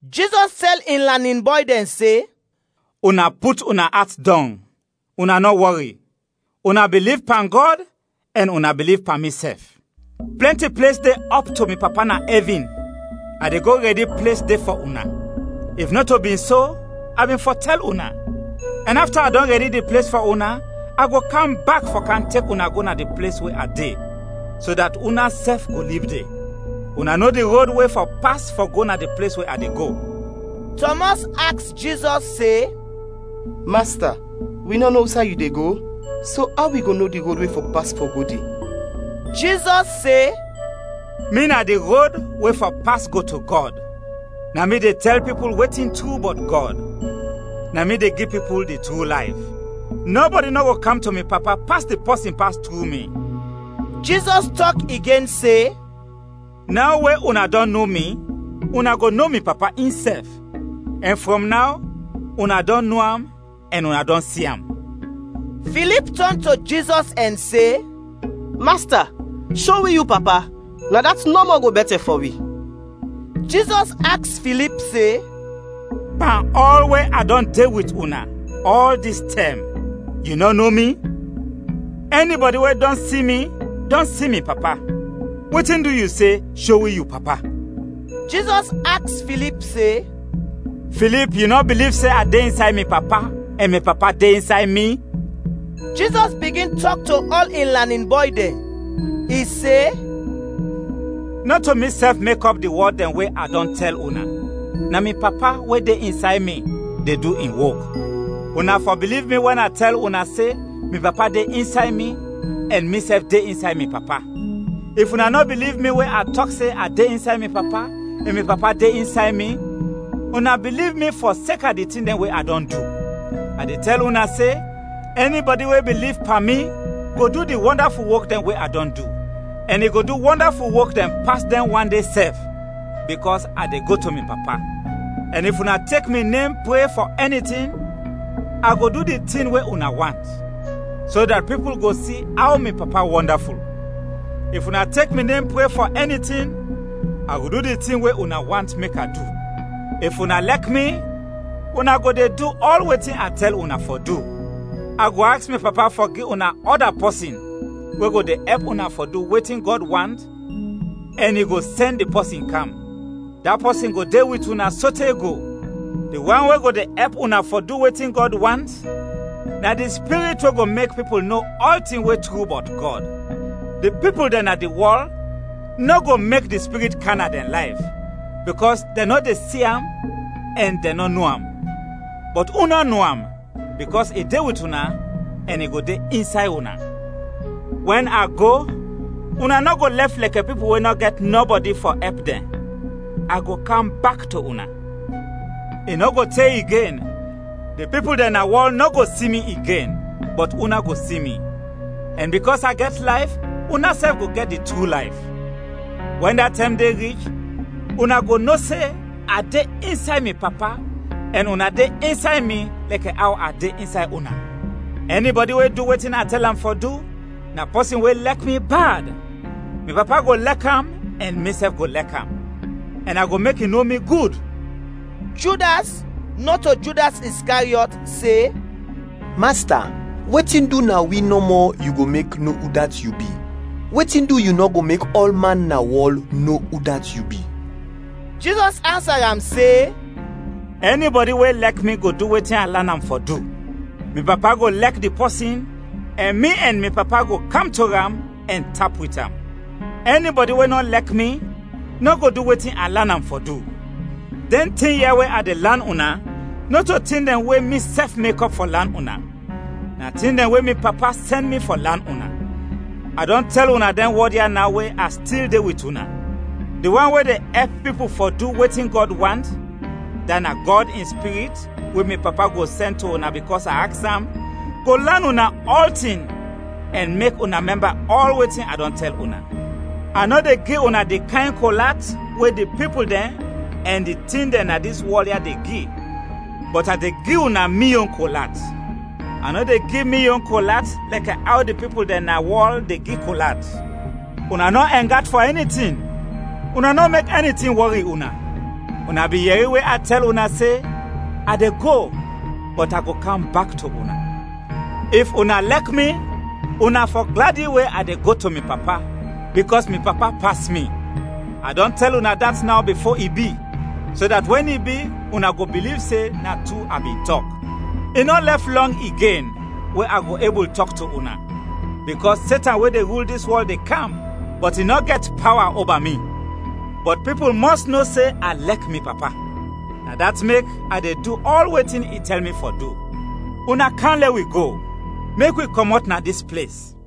Jizɔs tɛl in lanin bɔy dɛn se, “Una put una at dɔng, una nɔ wɔri. Una biliv pan Gɔd, ɛn una biliv pan misɛf. Plɛnti ples de ɔp to mi Papa na ɛvin; a de go rɛdi ples de fɔ una. If nɔto bin so, a bin fɔ tɛl una. Ɛn afta a dɔn rɛdi di ples fɔ una, a go kam bak fɔ kam tek una go na di ples we a de, so dat unasɛf go lib de. Una no di rod we fɔ pas fɔ go na di ples we a de go.” Tɔmɔs aks Jizɔs se, “Masta, wi nɔ no usay yu de go, so aw wi go no di rod we fɔ pas fɔ go de?” Jizɔs se, “Mi na di rod we fɔ pas go to Gɔd, na mi de tɛl pipul wetin tru bɔt Gɔd, na mi de gi pipul di tru layf; nɔbɔdi nɔ go kam to mi Papa pas di pɔsin pas tru mi.” Jizɔs tɔk igen se, “Naw we una dɔn no mi, una go no mi Papa insɛf, ɛn frɔm naw una dɔn no am ɛn una dɔn si am.” Filip tɔn to Jizɔs ɛn se, “Masta, sho wi yu Papa, na dat nɔmɔ go bɛtɛ fɔ wi.” Jizɔs aks Filip se, “Pan ɔl we a dɔn de wit una ɔl dis tɛm, yu nɔ no mi? Ɛnibɔdi we dɔn si mi, dɔn si mi Papa. Wetin du yu se, ‘Sho wi yu Papa?’” Jizɔs aks Filip se, “Filip, yu nɔ biliv se a de insay mi Papa ɛn mi Papa de insay mi?” Jizɔs bigin tɔk to ɔl in lanin bɔy dɛn. I se, “Nɔto misɛf mekɔp di wɔd dɛn we a dɔn tɛl una, na mi Papa, we de insay mi, de du in wok. Una fɔ biliv mi wɛn a tɛl una se mi Papa de insay mi ɛn misɛf de insay mi Papa. If una nɔ biliv mi we a tɔk se a de insay mi Papa ɛn mi Papa de insay mi, una biliv mi fɔseka di tin dɛn we a dɔn du. A de tɛl una se, ɛnibɔdi we biliv pan mi, go du di wɔndaful wok dɛn we a dɔn du, ɛn i go du wɔndaful wok dɛn pas dɛn wan de sɛf, bikɔs a de go to mi Papa. Ɛn if una tek mi nem pre fɔ ɛni tin, a go du di tin we una want, so dat pipul go si aw mi Papa wɔndaful. If una tek mi nem pre fɔ ɛni tin, a go du di tin we una want mek a du. “If una lɛk mi, una go de du ɔl wetin a tɛl una fɔ du. A go aks mi Papa fɔ gi una ɔda pɔsin we go de ɛp una fɔ du wetin Gɔd want ɛn i go sɛn di pɔsin kam. Da pɔsin go de wit una sote go. Di wan we go de ɛp una fɔ du wetin Gɔd want, na di Spirit we go mek pipul no ɔltin we tru bɔt Gɔd. Di pipul dɛn na di wɔl nɔ go mek di Spirit kam na dɛn layf, bikɔs dɛn nɔ de si am ɛn dɛn nɔ no am. Bɔt una no am, bikɔs i de wit una ɛn i go de insay una. “Wɛn a go, una nɔ go lɛf lɛkɛ pipul we nɔ gɛt nɔbɔdi fɔ ɛp dɛn, a go kam bak to una. I nɔ go te igen, di pipul dɛn na wɔl nɔ go si mi igen, bɔt una go si mi; ɛn bikɔs a gɛt layf, unasɛf go gɛt di tru layf. Wɛn da tɛm de rich, una go no se a de insay mi Papa ɛn una de insay mi lɛkɛ aw a de insay una. “Ɛnibɔdi we du wetin a tɛl am fɔ du, na pɔsin we lɛk mi bad. Mi Papa go lɛk am ɛn misɛf go lɛk am; ɛn a go mek i no mi gud.” Judas, nɔto Judas Iskariɔt, se, “Masta, wetin du na wi nɔmɔ yu go mek no udat yu bi; wetin du yu nɔ go mek ɔlman na wɔl no udat yu bi?” Jizɔs ansa am se, “Ɛnibɔdi we lɛk mi go du wetin a lan am fɔ du. Mi Papa go lɛk di pɔsin, ɛn mi ɛn mi Papa go kam to am, ɛn tap wit am. Ɛnibɔdi we nɔ lɛk mi nɔ go du wetin a lan am fɔ du. Dɛn tin ya we a de lan una, nɔto tin dɛn we misɛf mekɔp fɔ lan una, na tin dɛn we mi Papa sɛn mi fɔ lan una. “A dɔn tɛl una dɛn wɔd ya naw we a stil de wit una. Di wan we de ɛp pipul fɔ du wetin Gɔd want, dat na Gɔd in Spirit, we mi Papa go sɛn to una bikɔs a aks am, go lan una ɔltin ɛn mek una mɛmba ɔl wetin a dɔn tɛl una. “A nɔ de gi una di kayn kol at we di pipul dɛn ɛn di tin dɛn na dis wɔl ya de gi, bɔt a de gi una mi yon kol at. A nɔ de gi mi yon kol at lɛkɛ aw di pipul dɛn na wɔl de gi kol at. Una nɔ ɛng at fɔ ɛni tin, una nɔ mek ɛni tin wɔri una. Una bin yɛri we a tɛl una se, ‘A de go, bɔt a go kam bak to una’. If una lɛk mi, una fɔ gladi we a de go to mi Papa, bikɔs mi Papa pas mi. A dɔn tɛl una dat naw bifo i bi, so dat wɛn i bi, una go biliv se na tru a bin tɔk. I nɔ lɛf lɔng igen we a go ebul tɔk to una, bikɔs Setan we de rul dis wɔl de kam, bɔt i nɔ gɛt pawa oba mi. Bɔt pipul mɔs no se a lɛk mi Papa; na dat mek a de du ɔl wetin i tɛl mi fɔ du. “Una kam lɛ wi go, mek wi kɔmɔt na dis ples.